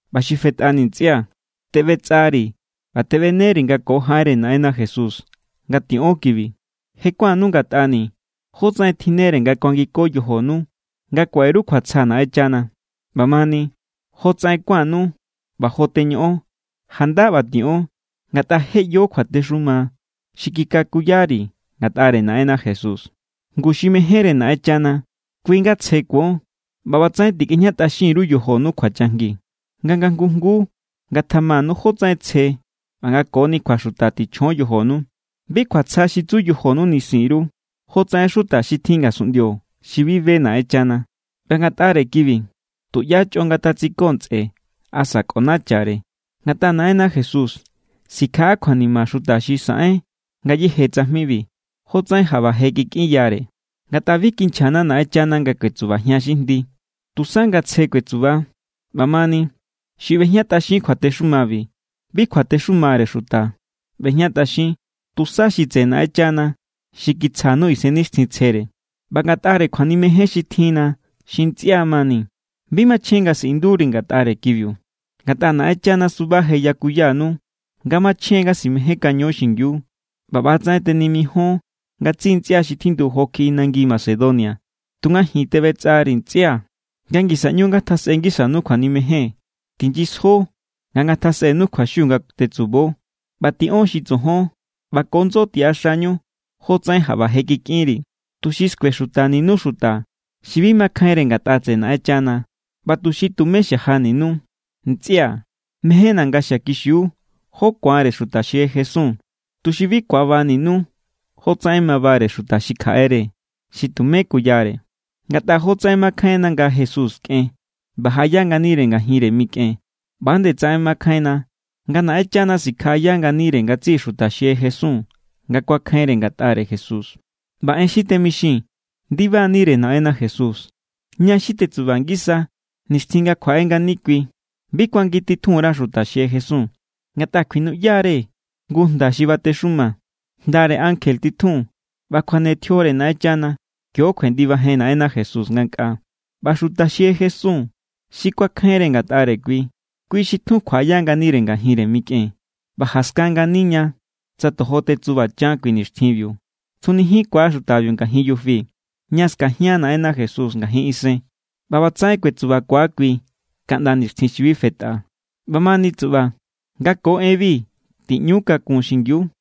ꞌBa xi fetꞌani, ntsꞌia̱, teꞌbetsꞌari̱ ꞌba teꞌbeneri̱ nga ko jaꞌenre Naꞌenna Jesús nga tiꞌon kibi. Je kuánnu ngatꞌani̱ jótsaꞌen tjinnere nga kuangiko yojonu nga kuaꞌe_ru kjuatsja Naꞌenchana. ꞌBamani, jotsaꞌen kuánnu ꞌba jo teñoꞌon, janda ꞌba tiꞌon. Ngatꞌa je ꞌyo kjuatexuma xi kikakuyari̱ ngatꞌare Naꞌenna Jesús. Ngu xi mejénre Naꞌenchana, kui= nga tsje kuon. ꞌBa ꞌbatsaꞌen tikꞌejñatꞌaxin_ru yojonu kjuachajngi. Nga nga jngu jnguu ngatjamanu jótsaꞌen tsje ꞌba nga koni kjuaxuta tichjon yojonu. Bi kjuatsja xi tsu yojonu nisin_ru, jo tsaꞌen xuta xi tjin ngasunꞌndio xi bi be Naꞌenchana. ꞌBa ngatꞌare kibi tuꞌyá chꞌo ngatatsiko ntsꞌe asa kꞌonachare. Ngatꞌa Naꞌenna Jesús sikjaꞌa kjuanima xuta xi saꞌen ngayéje tsajmibi, jotsaꞌen jaꞌba je kikꞌinyare. Ngatꞌa bi kinchjana̱ Naꞌenchana nga kuetsubajian xi jndi, tusa nga tsje kuetsuba. ꞌBamani, xi ꞌbejñatꞌaxin kjuatexumabi, bi kuatexumare xuta ꞌbejñatꞌaxin, tusa xi tseꞌe Naꞌenchana xi kitsjanu Isennixtjintsjere. ꞌBa ngatꞌare kjuanimejen xi tjinna xi ntsꞌia mani, bi machjen nga siꞌinduri̱ ngatꞌare kibiu. Ngatꞌa Naꞌenchana suba je yakuyanu nga machjen= nga simejénkaño xingiu. ꞌBa ꞌba=tsaꞌen tenimijon ngatsiꞌi ntsꞌia xi tjindu jo kjiꞌi nangi Macedonia, tunga ji̱n teꞌbetsꞌari̱ ntsꞌia̱, nga ngisa ꞌñu ngatjasꞌe ngisanu kjuanimejen. Tinyisjo nga ngatjasꞌenu kjuaxiu nga tetsubo, ꞌba tiꞌon xi tsojon, ꞌba ko ndso tiꞌaxañu jotsaꞌen jaꞌba je kikꞌinri̱, tuxi skuexutaninu xuta xi bi makjainre ngatꞌa tseꞌe Naꞌenchana ꞌba tuxi tumé xajaninu. Ntsꞌia̱, mejénni̱ nga xiakixiu jó ku̱anre xuta xi je jesun, tuxi bi ku̱abaninu jotsaꞌen mabare xuta xi kjaꞌere, xi tumé kuyare. Ngatꞌa jotsaꞌen makjainna nga Jesús kꞌen ꞌba jaꞌaya nganire ngajinre mikꞌen, ꞌba=nde tsaꞌen makjainna nga Naꞌenchana sikjaꞌaya nganire ngatsiꞌi xuta xi jesun nga kuakjainre ngatꞌare Jesús. ꞌBa en xi temixii̱n ndibanire Naꞌenna Jesús. Ña xi tetsuba ngisa nixtjin nga kjuaꞌe ngani kui bi kuangititjun_ra xuta xi je jesun. Ngatꞌa kjuinuꞌya=re jngu jnda xi batexuma, jndare ankje titjun, ꞌba kjuane tjiore Naꞌenchana. Kio kjuendibajen Naꞌenna Jesús ngankꞌaa. ꞌBa xuta xi je jesun xi kuakjainre ngatꞌare kui, kui xi tjun kjuaꞌaya nganire ngajinre mikꞌen. ꞌBa jaskan ngani ña tsa tojo tetsubachan kui nixtjinbiu stunijinkua xutabiu ngajin yufi, ña skajian Naꞌenna Jesús ngajin isen. ꞌBa ꞌbatsaꞌen kuetsubakua kui kaꞌnda nixtjin xi bi fetꞌa. ꞌBamani tsuꞌba, nga ko enbi tiꞌñu kakun xingiu.